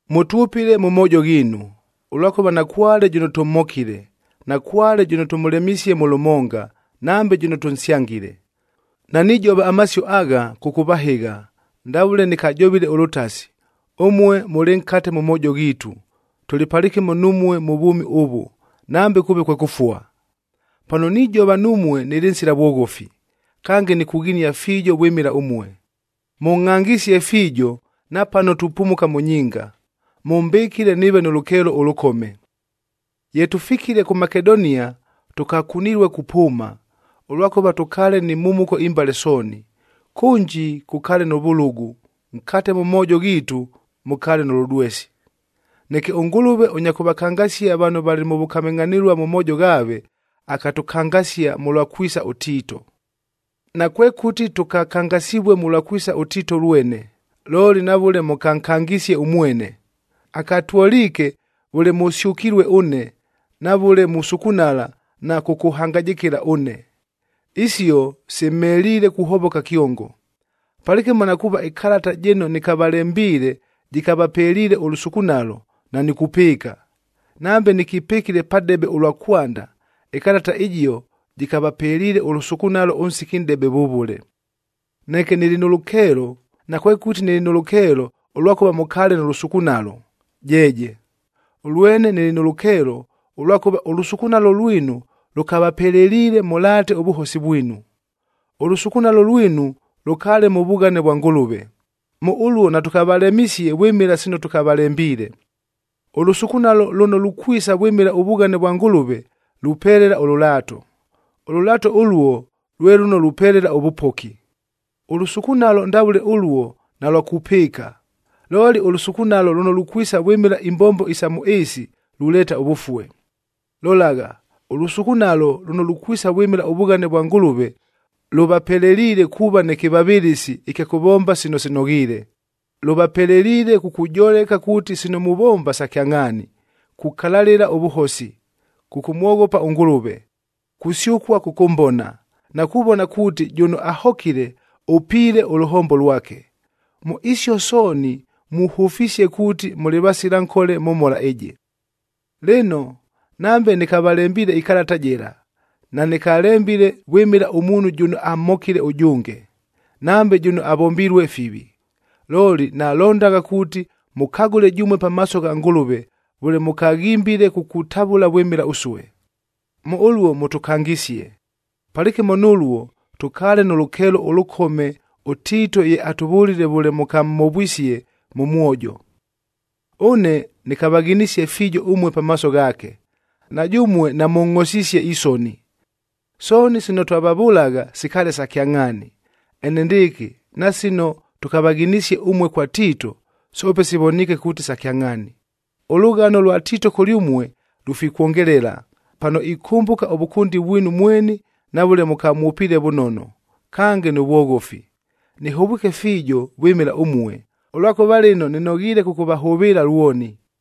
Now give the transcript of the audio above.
Mʉtwʉpɨle mʉ moojo ghiinu, ʉlwakʉva nakwale jʉno tʉmhokile, nakwale jʉno tʉmʉlemisie mʉ lʉmonga, nambe jʉno tʉnsyangile. Nanijova amasio agha, kʉkʉvahɨgha, ndavʉle nɨkajovile ʉlʉtasi, ʉmue mʉlɨ nkate mʉ moojo ghiitu, tʉlɨ palɨkɨmo numue mʉ vwʉmi ʉvʉ, nambe kʉʉve kwe kʉfua. Pano nijova numue nɨlɨ nsila vwoghofi, kange nikughinia fiijo vwɨmɨla ʉmue. Mʉngʼhangisie fiijo, napano tupumuka mʉ nyinga, mʉmbɨkile nɨɨve nʉ lʉkeelo ʉlʉkome. Ye tʉfikile kʉ Makedonia tʉkakunilue kupʉʉma, ʉlwakʉva tʉkaale ni mhumuko imbale sooni: kʉnji kʉkaale nʉ vʉlʉgʉ, nkate mʉ moojo ghiitu mʉkaale nʉ lʉdwesi. Neke ʉNgʉlʉve ʉnya kʉvakangasia vano valɨ mʉ vʉkamɨngʼhanɨlua mʉ moojo ghaave, akatʉkangasia mʉlwa kwisa ʉTiito. Nakwekʉti tʉkakangasivue mʉlwa kwisa ʉTiito lwene, looli na vʉle mʉkankangisie ʉmwene. Akatwoliike vʉle mʉsyʉkilue ʉne, na vʉle musukunala na kʉkʉhangajɨkɨla ʉne. Isio simheliile kuhovoka kyongo. Palɨkɨmo na kuuva ɨkalata jɨno nɨkavalembiile jɨkavapeliile ʉlʉsukunalo, nanikupɨɨka. Nambe nɨkipɨkile padebe ʉlwa kwanda, ɨkalata ɨjio jɨkavapeliile ʉlʉsukunalo ʉnsiki nʼdebe vʉvʉle. Neke nɨlɨ nʉ lʉkeelo, nakwekʉti nɨlɨ nʉ lʉkeelo ʉlwakʉva mʉkaale nʉ lʉsukunalo, jeeje! Ʉlwene nɨlɨ nʉ lʉkeelo, ʉlwakʉva ʉlʉsukunalo lwinu lʉkavapeleliile mʉlaate ʉvʉhosi vwinu. Ʉlʉsukunalo lwinu lʉkaale mʉ vughane vwa Ngʉlʉve, mʉ ʉluo natʉkavalemisie vwɨmɨla sino tʉkavalembiile. Ʉlʉsukunalo lʉno lukwisa vwɨmɨla ʉvughane vwa Ngʉlʉve lupelela ʉlʉlaato. Ʉlʉlaato ʉluo, lwe lʉno lupelela ʉvʉpoki. Ʉlʉsukunalo ndavʉle ʉluo nalwa kupɨɨka. Looli ʉlʉsukunalo lʉno lukwisa vwɨmɨla imbombo sa mʉ ɨɨsi, luleeta ʉvʉfue. Lolagha, ʉlʉsukunalo lʉno lukwisa vwɨmɨla ʉvughane vwa Ngʉlʉve, lʉvapeleliile kuuva nɨ kɨvavɨlɨsi ɨkya kʉvomba sino sinoghiile, lʉvapeleliile kukujoleka kuuti sino muvomba sa kyangʼhaani, kukalalɨla ʉvʉhosi, kʉkʉmwoghopa ʉNgʉlʉve, kusyʉkua kʉkʉmbona, na kuvona kuuti jʉno ahokile ʉpiile ʉlʉhombo lwake. Mʉ isio sooni muhʉfisie kuuti mʉlɨ vasila nkole mʉ mhola ɨjɨ. Lɨno, nambe nɨkavalembiile ɨkalata jɨla, nanɨkalembile vwɨmɨla ʉmuunhu jʉno amhokile ʉjʉnge, nambe jʉno avombilue fivi. Looli nalondagha kuuti mʉkagʉle jʉmue pamaaso gha Ngʉlʉve, vʉle mʉkaghimbile kukutavʉla vwɨmɨla ʉsue. Mʉ ʉluo mʉtʉkangisie. Palɨkɨmo nʉluo, tʉkaale nʉ lʉkeelo ʉlʉkome ʉTiito ye atʉvʉlile vʉle mʉkamhovwisie mʉ mwojo. Ʉne nɨkavaghinisie fiijo ʉmue pamaaso ghaake, na jʉmue namʉngʼhosisie isoni. Sooni sino twavavʉlagha sikaale sa kyangʼhaani. Enendɨɨkɨ, na sino tʉkavaghinisie ʉmue kwa Tiito, soope sivoniike kuuti sa kyangʼhaani. Ʉlʉghano lwa Tiito kʉlyʉmue lufikwongelela, pano ikʉmbʉka ʉvʉkʉndi vwinu mweni na vʉle mʉkamwʉpiile vʉnono, kange nʉ vwoghofi. Nɨhovwike fiijo vwɨmɨla ʉmue, ʉlwakʉva lɨno nɨnoghiile kʉkʉvahʉvɨɨla lwoni.